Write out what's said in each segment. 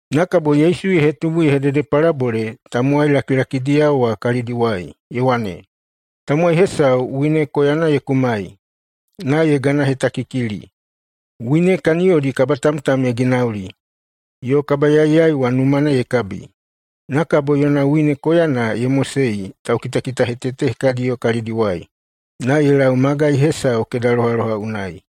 Na kabo Yesu ye hetubu ye hededepalabole [tamowai lakilakidiyao wa] kalidiwai ye wane, “Tamowai hesau wine koyana ye kumai, na ye ganahetakikili, wine kaniyodi kabatamtam ye ginauli, yo kabayaiyaiwa numana ye kabi. Na kabo yona wine koyana ye mosei taukitakitahetete hekadiyo kalidiwai na ye lau magai hesau keda lohaloha unai.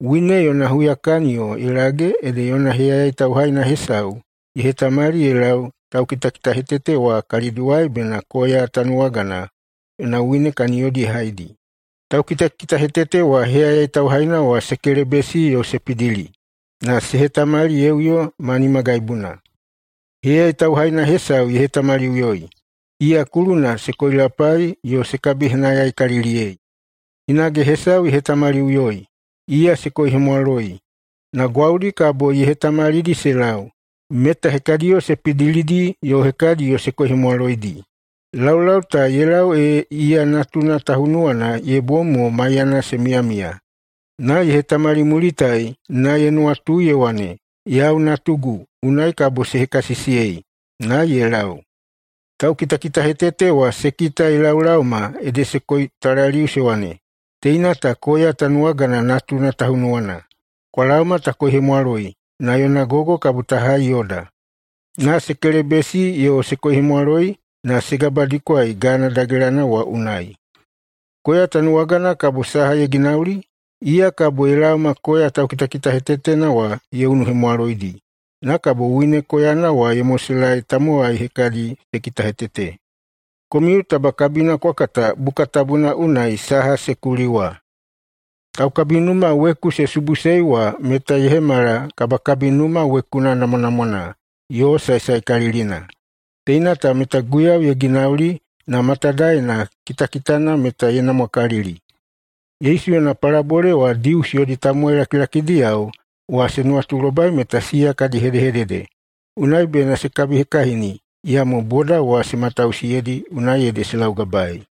Wine yona huyakaniyo ye lage ede yona heyayai tauhaina hesau ye hetamali ye lau taukitakitahetete wa kalidiwai bena koya tanuwagana yona wine kaniyodi ye haidi. Taukitakitahetete wa heyayai tauhaina wa se kelebesi yo se pidili, na se hetamali ye uyo ma nimagaibuna. Heyayai tauhaina hesau ye hetamaliꞌuyoi. Iya kuluna se koilapai yo se kabihenayaikaliliyei. Hinage hesau ye hetamaliꞌuyoi. Iya se koihemwaloi. Na gwaudi kabo ye hetamalidi se lau, meta hekadiyo se pidilidi yo hekadiyo se koihemwaloidi. Laulau ta ye lau ee iya natuna tahunuwana ye bom mo maiyana se miyamiya. Na ye hetamalimulitai na ye nuwatui ye wane, ‘Yau natugu, unai kabo se hekasisiyei.’ [Na ye lau.] Taukitakitahetete wa se kita ye laolaoma ede se koitalaliu se wane, ‘Teina ta koya tanuwagana natuna tahunuwana. Kwa laoma ta koihemwaloi, na yona gogo kabo ta hai yoda.’ Na se kelebesi yo se koihemwaloi na se gabadikwaei gana dagelana wa unai. Koya tanuwagana kabo saha ye ginauli? Iya kabo ye laoma koya taukitakitahetetena wa ye unuhemwaloidi, na kabo wine koyana wa ye moselaei tamowai hekadi se kitahetete. Komiu taba kabina kwa kata Buka Tabuna unai saha se kuli wa, ‘Taukabinuma weku se subuꞌusei wa meta ye hemala kabakabinuma wekuna namwanamwana yo saesaekalilina. Teina ta meta Guiyau ye ginauli, na matadaena kitakitana meta ye namwakalili.’” Yesu yona palabole wa Dius yodi tamowai lakilakidiyao wa se nuwatulobai meta siya kadi hedehedede, unai bena se kabihekahini. Iyamo boda wa se matausiyeidi, unai ede se laugabaei.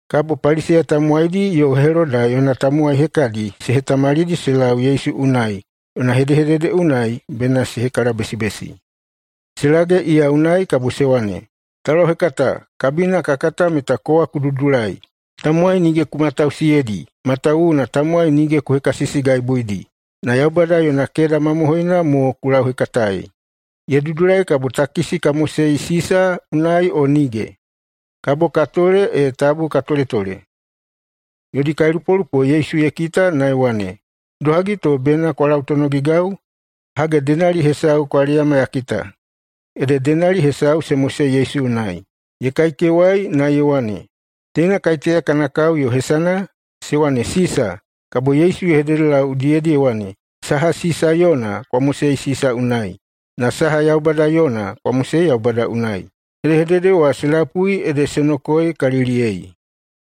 Kabo Paliseya tamowaidi yo Heloda yona tamowai hekadi se hetamalidi se lau Yesu unai yona hedehedede unai bena se hekalabesibesi. Se lage iya unai kabo se wane, “Taulauhekata, kabina ka kata meta kowa ku dudulai. Tamowai nige ku matausiyeidi, matawuwuna tamowai nige ku hekasisigaibuidi. Na Yaubada yona keda mamohoina mo ku lauhekataei. Ye dudulai kabo takisi ka mosei Sisa unai o nige? Kabo ka tole o tabu ka toletole?” Yodi kailupolupo Yesu ye kita na ye wane, “Idohagi to bena kwa lautonogigau? Hage, denali hesau kwa leyama ya kita.” Ede denali hesau se mosei Yesu unai. [Ye kaikewai] na ye wane, “Teina kaiteya kana kao yo hesana?” Se wane, “Sisa.” Kabo Yesu ye hededelau udiyedi ye wane, “Saha Sisa yona, kwa mosei Sisa unai, na saha Yaubada yona, kwa mosei Yaubada unai.” Hedehedede wa se lapui ede se nokoeikaliliyei.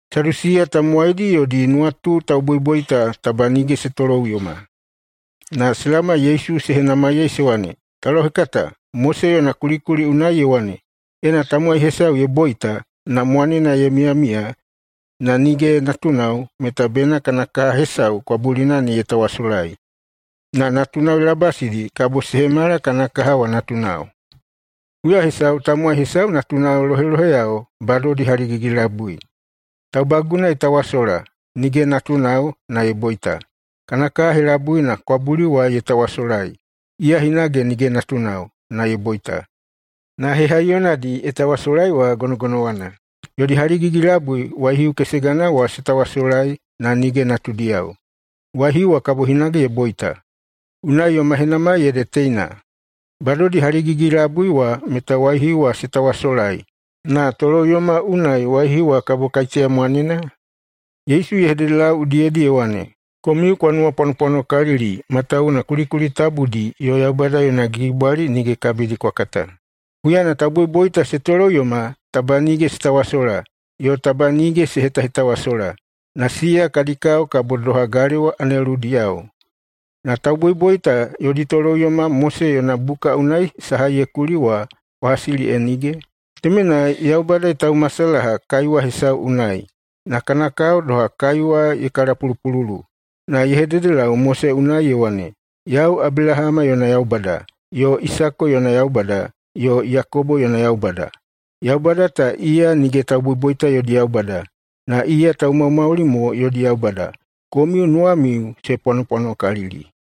Sadusiya tamowaidi yodi nuwatu tauboiboita taba nige se toloꞌuyoma. Na se laoma Yesu se henamaiyei se wane, “Taulauhekata, Mose yona kulikuli unai ye wane, ena tamowai hesau ye boita, na mwanena ye miyamiya, na nige natunao, meta bena kana kaha hesau kwabulina ne ye tawasolai na natunao ye labasidi, kabo se hemala kana kaha wa natunao. Huya hesau tamowai hesau natunao loheloheyao badodi haligigi-labui. Taubaguna ye tawasola, nige natunao, na ye boita. Kana kaha helabuina kwabuli wa ye tawasolai. Iya hinage nige natunao, na ye boita. Na hehaiyonadi ye tawasolai wa gonogonowana. Yodi haligigi-labui waihiu kesegana wa se tawasolai, na nige natudiyao. Waihiu wa kabo hinage ye boita. [Unai yoma henamai ede teina:] Badodi haligigi-labui wa meta waihiu wa se tawasolai, na toloꞌuyoma unai waihiu wa kabo kaiteya mwanena?” Yesu ye hededelau udiyedi ye wane, “Komiu kwa nuwapwanopwanokalili matawuwuna kulikuli tabudi yo Yaubada yona gigibwali nige kabidi kwa kata. Huyana tauboiboita se toloꞌuyoma taba nige se tawasola yo taba nige se hetahetawasola. Na siya kadi kao kabo doha galewa aneludiyao. Na tauboiboita yodi toloꞌuyoma Mose yona buka unai saha ye kuli wa kwa hasili e nige? Temenai, Yaubada ye taumasalaha kaiwa hesau unai [na kana kao doha kaiwa ye kalapulupululu]. Na ye hededelau Mose unai ye wane, ‘Yau Abelahama yona Yaubada, yo Isako yona Yaubada, yo Yakobo yona Yaubada.’ Yaubada ta iya nige tauboiboita yodi Yaubada, na iya taumaumauli mo yodi Yaubada. Komiu nuwamiu se pwanopwanokalili.”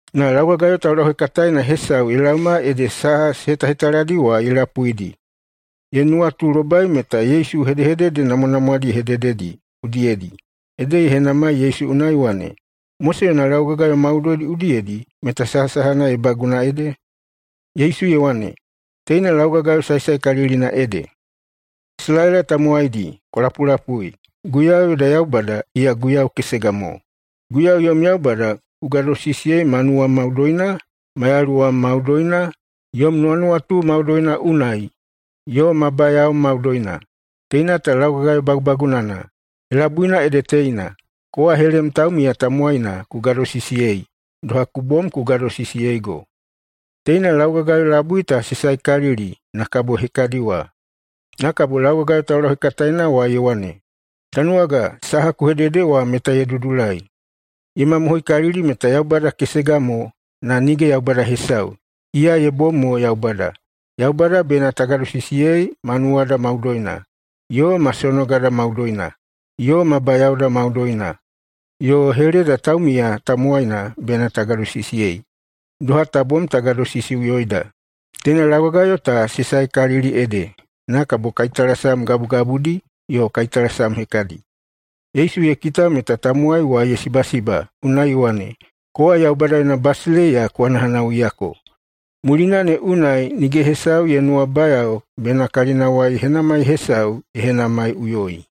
Na laugagayo taulauhekataena hesau ye laoma ede saha se hetahetaladi wa ye lapuidi. Ye nuwatulobai meta Yesu hedehedede namwanamwadi ye hedededi udiyedi, ede ye henamai Yesu unai ye wane, “Mose yona laugagayo maudoidi udiyedi meta sahasahana ye baguna ede?” Yesu ye wane, “Teina laugagayo saesaekalilina ede: ‘Isalaela tamowaidi, kwa lapulapui! Guiyau yoda Yaubada, iya Guiyau kesega mo. Guiyau yom Yaubada ku gadosisiyei ma nuwam maudoina, ma yaluwam maudoina, yom nuwanuwatu maudoina unai, yo ma bayaom maudoina.’ [Teina ta laugagayo bagubagunana.] Helabuina ede teina: ‘Kowa helem taumiya tamowaina ku gadosisiyei, doha ku bom ku gadosisiyeigo.’ Teina laugagayo labui ta se saekalili na kabo hekadi wa.” Na kabo laugagayo taulauhekataena wa ye wane, “Tanuwaga, saha ku hedede wa meta ye dudulai. Ye mamohoikalili meta Yaubada kesega mo, na nige Yaubada hesau, iya ye bom mo Yaubada. Yaubada bena ta gadosisiyei ma nuwada maudoina, yo ma sonogada maudoina, yo ma bayaoda maudoina. Yo heleda taumiya tamowaina bena ta gadosisiyei, doha ta bom ta gadosisiꞌuyoida. Teina laugagayo ta se saekalili ede, na kabo kaitalasam gabugabudi yo kaitalasam hekadi.” Yesu ye kita meta tamowai wa ye sibasiba, unai ye wane, “Kowa Yaubada yona basileiya ku hanahanawuiyako.” Mulina ne unai nige hesau ye nuwabayao bena kalinawai henamai hesau ye henamaiꞌuyoi.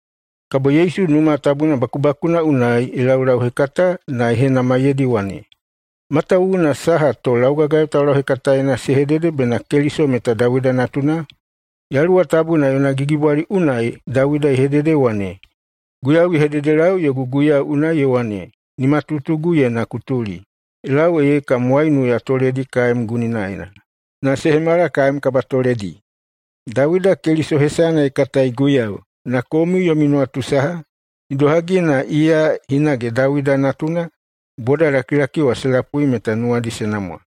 Kabo Yesu Numa Tabuna bakubakuna unai ye laulauhekata na ye henamaiyeidi ye wane, “Matawuwuna saha to laugagayo taulauhekataena se hedede bena Keliso meta Dawida natuna? Yaluwa Tabuna yona gigibwali unai Dawida ye hedede ye wane, ‘Guiyau ye hededelau yogu guiyau unai ye wane, “Nimatutuguyena ku tuli ye lau ee kam waiunu ya toledi kaem guninaena na se hemala kaem kabatoledi.” ’ Dawida Keliso hesana ye katai Guiyau. Na komiu yomi nuwatu saha, idohagi na iya hinage Dawida natuna?” Bodalakilaki wa se lapui meta nuwadi se namwa.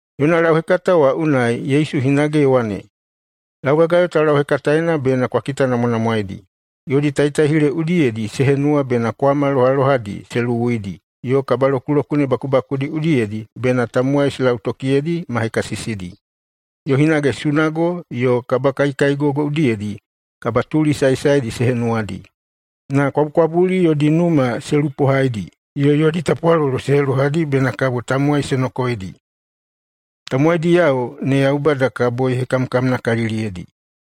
Yona lauhekata wa unai Yesu hinage ye wane, “Laugagayo taulauhekataena bena kwa kitanamwanamwaedi. Yodi taitaihile udiyedi se henuwa bena kwama lohalohadi se luwuidi yo kabalokulokune bakubakudi udiyedi bena tamowai se lautokiyeidi ma hekasisidi, yo hinage sunago yo kabakaikaigogo udiyedi kabatuli saesaedi se henuwadi. Na kwabukwabuli yodi numa se lupohaidi, yo yodi tapwalolo se helohadi bena kabo tamowai se nokoeidi. Tamowaidiyao ne Yaubada kabo ye hekamkamnakaliliyeidi.”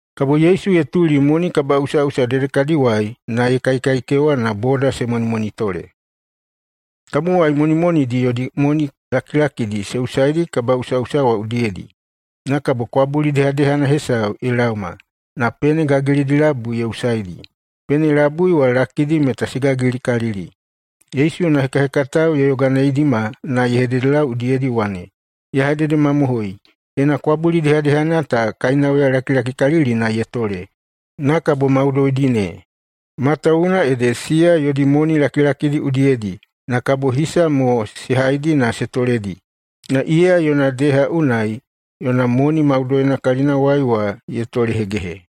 Kabo Yesu ye tuli moni kabaꞌusaꞌusa dedekadiwai na ye kaikaikewa na boda se monimonitole. Tamowai monimonidi yodi moni lakilakidi se usaidi kabaꞌusaꞌusa wa udiyedi. Na kabo kwabuli dehadehana hesau ye laoma, na pene gagilidi labui ye usaidi. Pene labui wa lakidi meta se gagilikalili. Yesu yona hekahekatao ye yoganeidima na ye hededelau udiyedi ye wane, “Ya hededemamohoi: Teina kwabuli dehadehana ta kainauya lakilakikalilina ye tole, na kabo maudoidi ne. Matawuwuna ede siya yodi moni lakilakidi udiyedi na kabo hisa mo se haidi na se toledi, na iya yona deha unai yona moni maudoina kalinawai wa ye tolehegehe.”